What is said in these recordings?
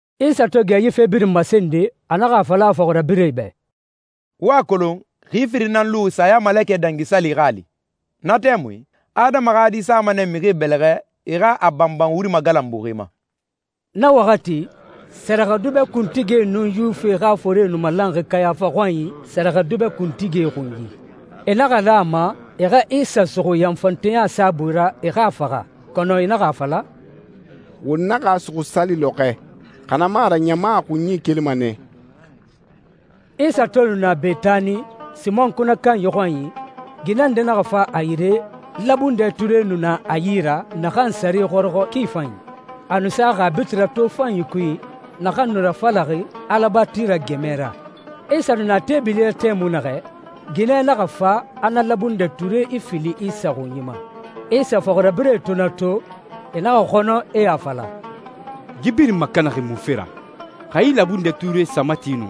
Isa to gɛ yi fe birin masende, a naxa a fala a fɔxirabirɛe bɛ, «Wo a kolon, xi firin nan luxi Sayamalekɛ Dangi Sali xa a li. Na tɛmui, Adama xa Di sama nɛ mixie bɛlɛxɛ e xa a banban wuri magalanbuxi ma.» Na waxati, sɛrɛxɛdubɛ kuntigie nun Yuwifie xa forie nu malanxi Kayafa xɔnyi, sɛrɛxɛdubɛ kuntigie xunyi. E naxa lan a ma e xa Isa suxu yanfanteya saabui ra, e xa a faxa. Kɔnɔ e naxa a fala, «Won naxa a suxu sali lɔxɔɛ, xa na mu a ra ɲama a xunyi ikelima nɛ.» Isa to nu na Betani, Simɔn kunɛ kanyi xɔnyi, ginɛ nde naxa fa a yire. Labundɛ ture nu na a yi ra, naxan sare xɔrɔxɔ ki fanyi. A nu saxi a bitirɛ tofanyi kui naxan nu rafalaxi alabatira gɛmɛ ra. Isa nu na teebili ra tɛmui naxɛ, ginɛ naxa fa, a na labundɛ ture ifili Isa xunyi ma. Isa fɔxirabirɛe to na to, e naxa xɔnɔ, e a fala, «Yi birin makanaxi munfe ra? Xa yi labundɛ ture sa mati nu,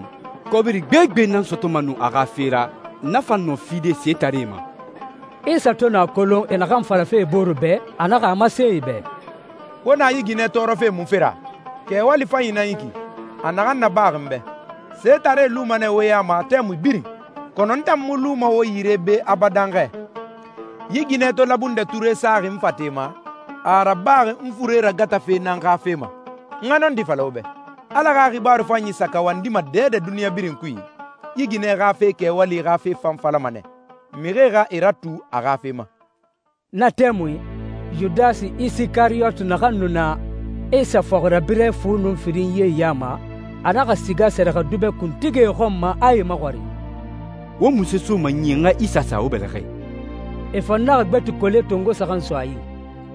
kɔbiri gbegbe nan sɔtɔma nu a xa fe ra, na fan nɔ fide setaree ma.» Isa to nu a kolon e naxan falafe e bore bɛ, a naxa a masen e bɛ, «Wo na yi ginɛ tɔɔrɔfe munfe ra? Kɛwali fanyi nan yi ki, a naxan nabaxi n bɛ. Setaree luma nɛ wo ya ma tɛmui birin, kɔnɔ n tan mu luma wo yi ra be abadan xɛ. Yi ginɛ to labundɛ ture saxi n fate ma, a a rabaxi n fure ragatafe nan xa fe ma. N xa nɔndi fala wo bɛ, Ala xa xibaaru fanyi sa kawandima dɛdɛ duniɲa birin kui, yi ginɛ xa kɛwali xa fe fan falama nɛ, mixie xa e ratu a xa fe ma.» Na tɛmui, Yudasi Isikariyoti, naxan nu na Isa fɔxirabirɛ fu nun firinyie ya ma, a naxa siga sɛrɛxɛdubɛ kuntigie xɔn ma, a e maxɔrin, «Wo munse soma n yi n xa Isa sa wo bɛlɛxɛ?» E fan naxa gbeti kole tongo saxan so a yi.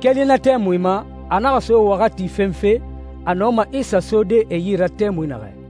Keli na tɛmui ma, a naxa so waxati fenfe a nɔma Isa sode e yi ra tɛmui naxɛ.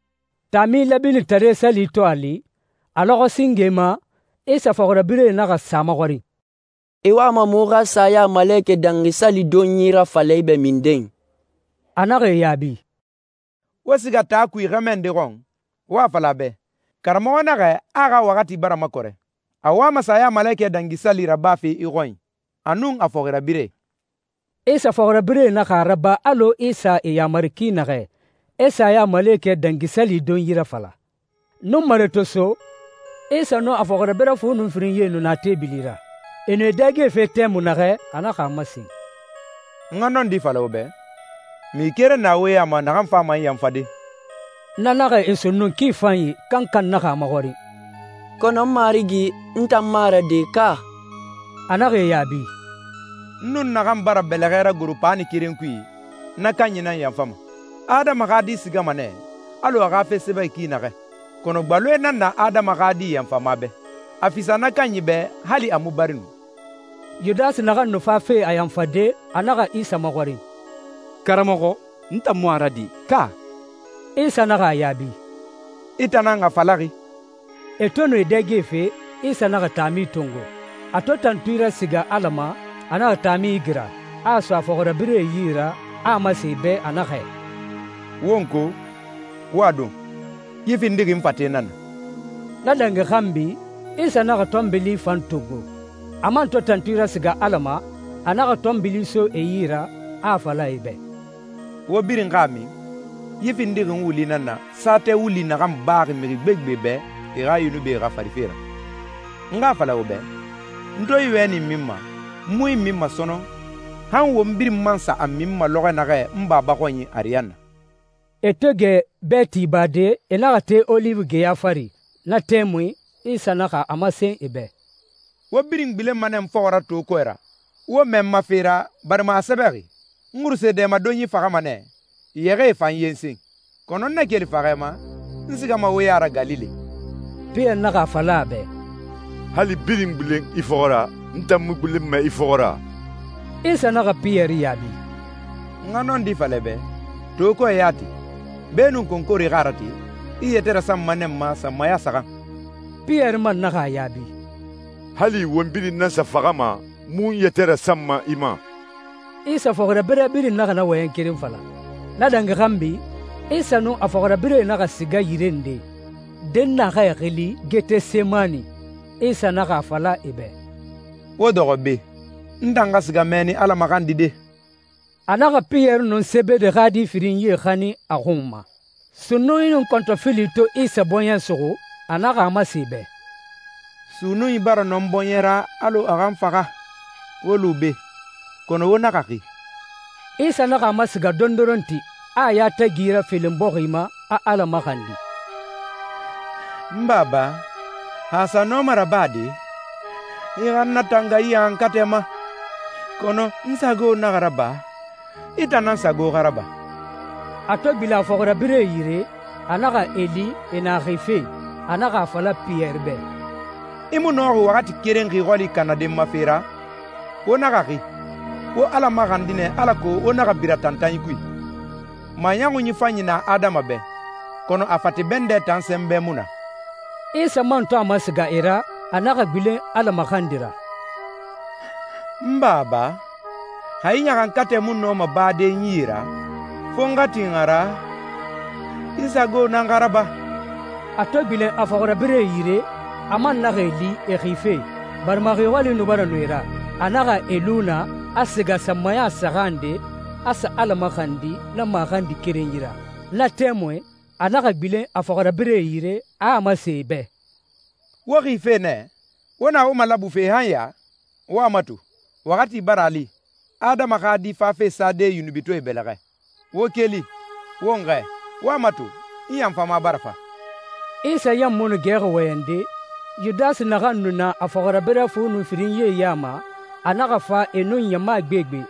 Taami Lɛbinitare Sali to a li, a lɔxɔɛ singe ma, Isa fɔxirabirɛe naxa sa a maxɔrin, «I wama muxu xa Sayamalekɛ Dangi Sali donyi rafala i bɛ minden?» A naxa e yaabi, «Wo siga taa kui xɛmɛ nde xɔn, wo a fala a bɛ, ‹Karamɔxɔ naxɛ a a xa waxati bara makɔrɛ. A wama Sayamalekɛ Dangi Sali rabafe i xɔnyi, a nun a fɔxirabirɛe.›» Isa fɔxirabirɛe naxa a raba alɔ Isa e yamari ki naxɛ, e Sayamalekɛ Dangi Sali donyi rafala. Nunmare to so, Isa nun a fɔxirabirɛ fu nun firinyie nu na teebili ra. E nu e dɛgefe tɛmui naxɛ, a naxa a masen, «N xa nɔndi fala wo bɛ, mixi keren na wo ya ma naxan fama n yanfade.» Na naxa e sunnun ki fanyi, kankan naxa a maxɔrin, «Kɔnɔ n Marigi, n tan mu a ra de, ka?» A naxa e yaabi, «N nun naxan bara bɛlɛxɛ ragoro paani keren kui, na kanyi nan n yanfama. Adama xa Di sigama nɛ alɔ a xa fe sɛbɛxi ki naxɛ, kɔnɔ gbaloe nan na Adama xa Di yanfama bɛ. A fisa na kanyi bɛ hali a mu bari nu.» Yudasi naxan nu fafe a yanfade, a naxa Isa maxɔrin, «Karamɔxɔ, n tan mu a ra de, ka?» Isa naxa a yaabi, «I tan nan a falaxi.» E to nu e dɛgefe, Isa naxa taami tongo. A to tantui rasiga Ala ma, a naxa taami igira, a a so a fɔxirabirɛe yi ra, a a masen e bɛ, a naxɛ, «Wo n ko, wo a don. Yi findixi n fate nan na.» Na dangi xanbi, Isa naxa tɔnbili fan tongo. A man to tantui rasiga Ala ma, a naxa tɔnbili so e yi ra, a a fala e bɛ, «Wo birin xa a min. Yi findixi n wuli nan na, saatɛ wuli naxan baxi mixi gbegbe bɛ e xa yunubie xafarife ra. N xa a fala wo bɛ, n to yi wɛni minma, n mu yi minma sɔnɔn, han won birin man sa a minma lɔxɔ naxɛ n Baba xɔnyi ariyanna.» E to gɛ bɛɛti bade, e naxa te Oliwi geya fari. Na tɛmui Isa naxa a masen e bɛ, «Wo birin gbilenma nɛ n fɔxɔ ra to kɔɛ ra, wo mɛɛ n ma fe ra, barima a sɛbɛxi, ‹N xuruse dɛmadonyi faxama nɛ, yɛxɛɛe fan yensen.› Kɔnɔ n na keli faxɛ ma, n sigama wo ya ra Galile.» Piyɛri naxa a fala a bɛ, «Hali birin gbilen i fɔxɔ ra, n tan mu gbilenma i fɔxɔ ra.» Isa naxa Piyɛri yaabi, «N xa nɔndi fala i bɛ, to kɔɛ yati, beenun konkore xa a rate, i i yɛtɛ rasanma nɛ n ma sanmaya saxan.» Piyɛri man naxa a yaabi, «Hali won birin nan sa faxama, n mu n yɛtɛ rasanma i ma!» Isa fɔxirabirɛ birin naxa na wɔyɛn keren fala. Na dangi xanbi Isa nun a fɔxirabirɛe naxa siga yire nde, dɛnnaxɛ xili Getesemani. Isa naxa a fala e bɛ, «Wo dɔxɔ be. N tan xa siga mɛnni Ala maxandide.» A naxa Piyɛri nun Sebede xa di firinyie xanin a xun ma. Sunnunyi nun kɔntɔfili to Isa bɔɲɛ suxu, a naxa a masen e bɛ, «Sunnunyi bara nɔ n bɔɲɛ ra alɔ a xa n faxa. Wo lu be, kɔnɔ wo naxa xi.» Isa naxa a masiga dondoronti, a a yatagi rafelen bɔxi ma, a Ala maxandi, «N Baba, xa a sa nɔma rabade, i xa n natanga yi ɲaxankatɛ ma. Kɔnɔ n sago naxa raba, i tan nan sago xa raba.» A to gbilen a fɔxirabirɛe yire, a naxa e li e na xife. A naxa a fala Piyɛri bɛ, «I mu nɔxi waxati keren xi xɔli kanade n ma fe ra? Wo naxa xi. Wo Ala maxandi nɛ alako wo naxa bira tantanyi kui. Maɲɔxun fanyi na adama bɛ, kɔnɔ a fate bɛndɛ tan sɛnbɛ mu na.» Isa man to a masiga e ra, a naxa gbilen Ala maxandi ra, «N Baba, xa yi ɲaxankatɛ mu nɔma bade n yi ra, fo n xa tin a ra, i sago nan xa raba.» A to gbilen a fɔxirabirɛe yire, a man naxa e li e xife, barima xi xɔli nu bara nɔ e ra. A naxa e lu naa, a siga sanmaya saxan nde, a sa Ala maxandi na maxandi kerenyi ra. Na tɛmui, a naxa gbilen a fɔxirabirɛe yire, a a masen e bɛ, «Wo xife nɛ? Wo na wo malabufe han ya? Wo a mato, waxati bara a li. Adama xa Di fafe sade yunubitɔɛe bɛlɛxɛ. Wo keli, won xɛɛ. Wo a mato, n yanfama bara fa.» Isa ɲan mu nu gɛxi wɔyɛnde, Yudasi, naxan nu na a fɔxirabirɛ fu nun firinyie ya ma, a naxa fa e nun ɲama gbegbe,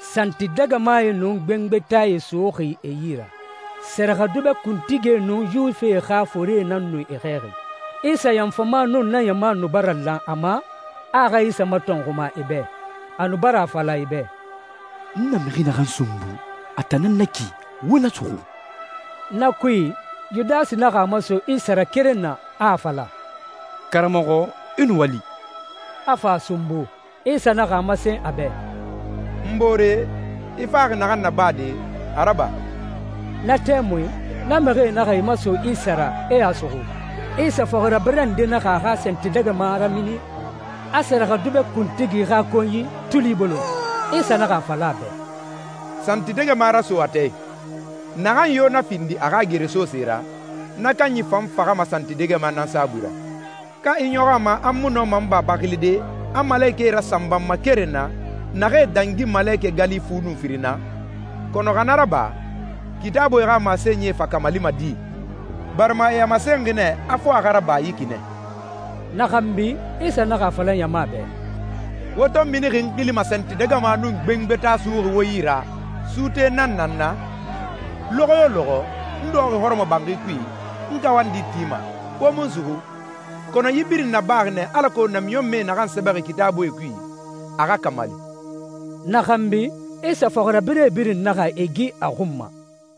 santidɛgɛmae nun gbengbetae suxuxi e yi ra. Sɛrɛxɛdubɛ kuntigie nun Yuwifie xa forie nan nu e xɛɛxi. Isa yanfama nun na ɲama nu bara lan a ma, a a xa Isa matɔnxuma e bɛ. A nu bara a fala e bɛ, «N na mixi naxan sunbu, a tan nan na ki. Wo na suxu.» Na kui, Yudasi naxa a maso Isa ra keren na, a a fala, «Karamɔxɔ, i nuwali,» a fa a sunbu. Isa naxa a masen a bɛ, «N boore, i faxi naxan nabade, a raba.» Na tɛmui, na mixie naxa e maso Isa ra, e a suxu. Isa fɔxirabirɛ nde naxa a xa santidɛgɛma ramini, a sɛrɛxɛdubɛ kuntigi xa konyi tuli bolon. Isa naxa a fala a bɛ, «Santidɛgɛma raso a tɛɛ i. Naxan yo na findi a xa geresose ra, na kanyi fan faxama santidɛgɛma nan saabui ra. Ka i ɲɔxɔ a ma a n mu nɔma n Baba xilide, a malekɛe rasanba n ma keren na, naxee dangi malekɛ gali fu nun firin na? Kɔnɔ xa na raba, Kitaabuie xa masenyie fa kamalima di? Barima e a masenxi nɛ a fo a xa raba yi ki nɛ.» Na xanbi, Isa naxa a fala ɲama bɛ, «Wo to minixi n xili ma santidɛgɛma nun gbengbeta suxuxi wo yi ra, suute nan na n na? Lɔxɔ yo lɔxɔ, n dɔxɔxi hɔrɔmɔbanxi kui, n kawandi tima, wo mu n suxu. Kɔnɔ yi birin nabaxi nɛ alako namiɲɔnmɛe naxan sɛbɛxi Kitaabui kui, a xa kamali.» Na xanbi, Isa fɔxirabirɛe birin naxa e gi a xun ma.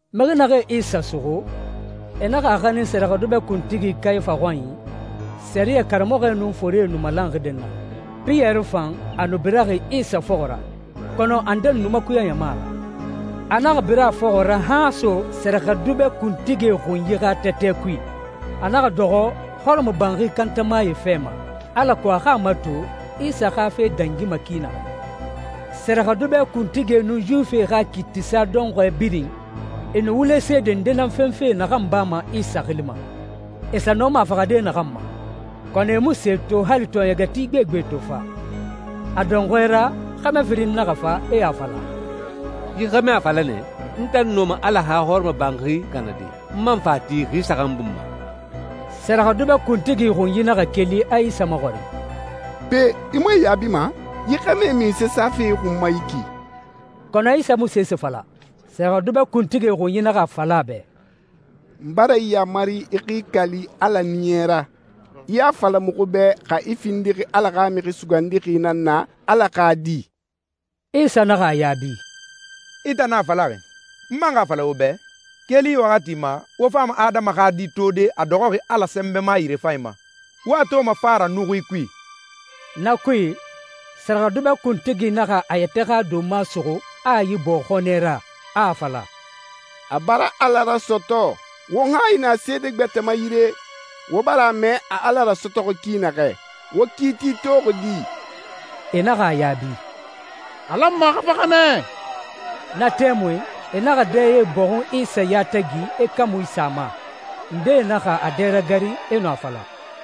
Mixi naxee Isa suxu, e naxa a xanin sɛrɛxɛdubɛ kuntigi Kayafa xɔnyi, sɛriyɛ karamɔxɔe nun forie nu malanxi dɛnnaxɛ. Piyɛri fan, a nu biraxi Isa fɔxɔ ra, kɔnɔ a ndedi nu makuyaxi ɲama ra. A naxa bira a fɔxɔ ra han a so sɛrɛxɛdubɛ kuntigie xunyi xa tɛtɛ kui. A naxa dɔxɔ hɔrɔmɔbanxi kantamae fɛ ma, alako a xa a mato Isa xa fe dangima ki naxɛ. Sɛrɛxɛdubɛ kuntigie nun Yuwifie xa kiitisa dɔnxɔɛ birin, e nu wule seede nde nan fenfe naxan bama Isa xili ma, e sa nɔma a faxade naxan ma. Kɔnɔ e mu se to, hali tɔɔɲɛgɛti gbegbe to fa. A dɔnxɔɛ ra, xɛmɛ firin naxa fa, e a fala, «Yi xɛmɛ a fala nɛ, ‹N tan nɔma Ala xa hɔrɔmɔbanxi kanade, n man fa a ti xi saxan bun ma.›» Sɛrɛxɛdubɛ kuntigi xunyi naxa keli, a Isa maxɔrin, «Pe, i mu e yaabima? Yi xɛmɛe munse safe i xun ma yi ki?» Kɔnɔ Isa mu sese fala. Sɛrɛxɛdubɛ kuntigie xunyi naxa a fala a bɛ, «N bara i yamari i xa i kali Ala Ɲiɲɛ ra, i a fala muxu bɛ xa i findixi Ala xa Mixi Sugandixi nan na, Ala xa Di.» Isa naxa a yaabi, «I tan nan a falaxi. N man xa a fala wo bɛ, keli yi waxati ma, wo fama Adama xa Di tode, a dɔxɔxi Ala Sɛnbɛma yirefanyi ma, wo a toma fa ra nuxuie kui.» Na kui, sɛrɛxɛdubɛ kuntigi naxa a yɛtɛ xa donma suxu, a ibɔɔ xɔnɛ ra, a a fala, «A bara Ala rasɔtɔ! Won hayi na seede gbɛtɛe ma yire? Wo bara a mɛ a Ala rasɔtɔxi ki naxɛ. Wo kiiti toxi di?» E naxa a yaabi, «A lanma a xa faxa nɛ.» Na tɛmui, e naxa dɛye bɔxun Isa yatagi, e kamui sin a ma. Ndee naxa a dɛ ragarin, e nu a fala,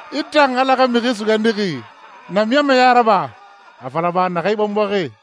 «I tan, Ala xa Mixi Sugandixi, namiɲɔnmɛɲa raba! A fala ba, naxan i bɔnbɔxi!»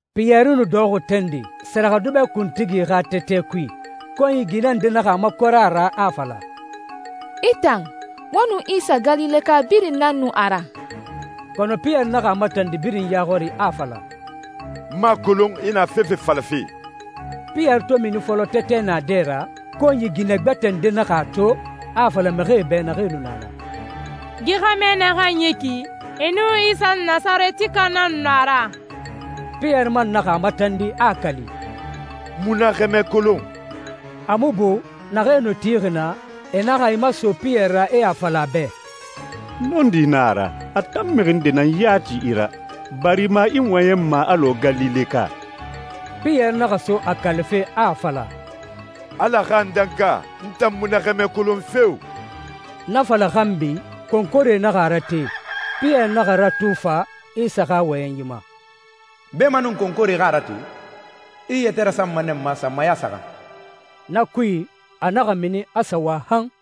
Piyɛri nu dɔxɔxi tande, sɛrɛxɛdubɛ kuntigi xa tɛtɛ kui. Konyi ginɛ nde naxa a makɔrɛ a ra, a a fala, «I tan, wo nun Isa Galileka birin nan nu a ra.» Kɔnɔ Piyɛri naxa a matandi birin ya xɔri, a a fala, «N mu a kolon i na fefe falafe!» Piyɛri to mini fɔlɔ tɛtɛ naadɛ ra, konyi ginɛ gbɛtɛ nde naxa a to, a a fala mixie bɛ naxee nu na naa, «Yi xɛmɛ naxan yi ki, e nun Isa Nasarɛtika nan nu a ra.» Piyɛri man naxa a matandi, a a kali, «N mu na xɛmɛ kolon!» A mu bu, naxee nu tixi naa, e naxa e maso Piyɛri ra, e a fala a bɛ, «Nɔndi nan a ra, a tan mixi nde nan yati i ra, barima i wɔyɛnma alɔ Galileka.» Piyɛri naxa so a kalife, a a fala «Ala xa n danka! N tan mu na xɛmɛ kolon feo!» Na fala xanbi, konkore naxa a rate. Piyɛri naxa ratu fa Isa xa wɔyɛnyi ma, «Beemanun konkore xa a rate, i i yɛtɛ rasanma nɛ n ma sanmaya saxan.» Na kui, a naxa mini, a sa wa han.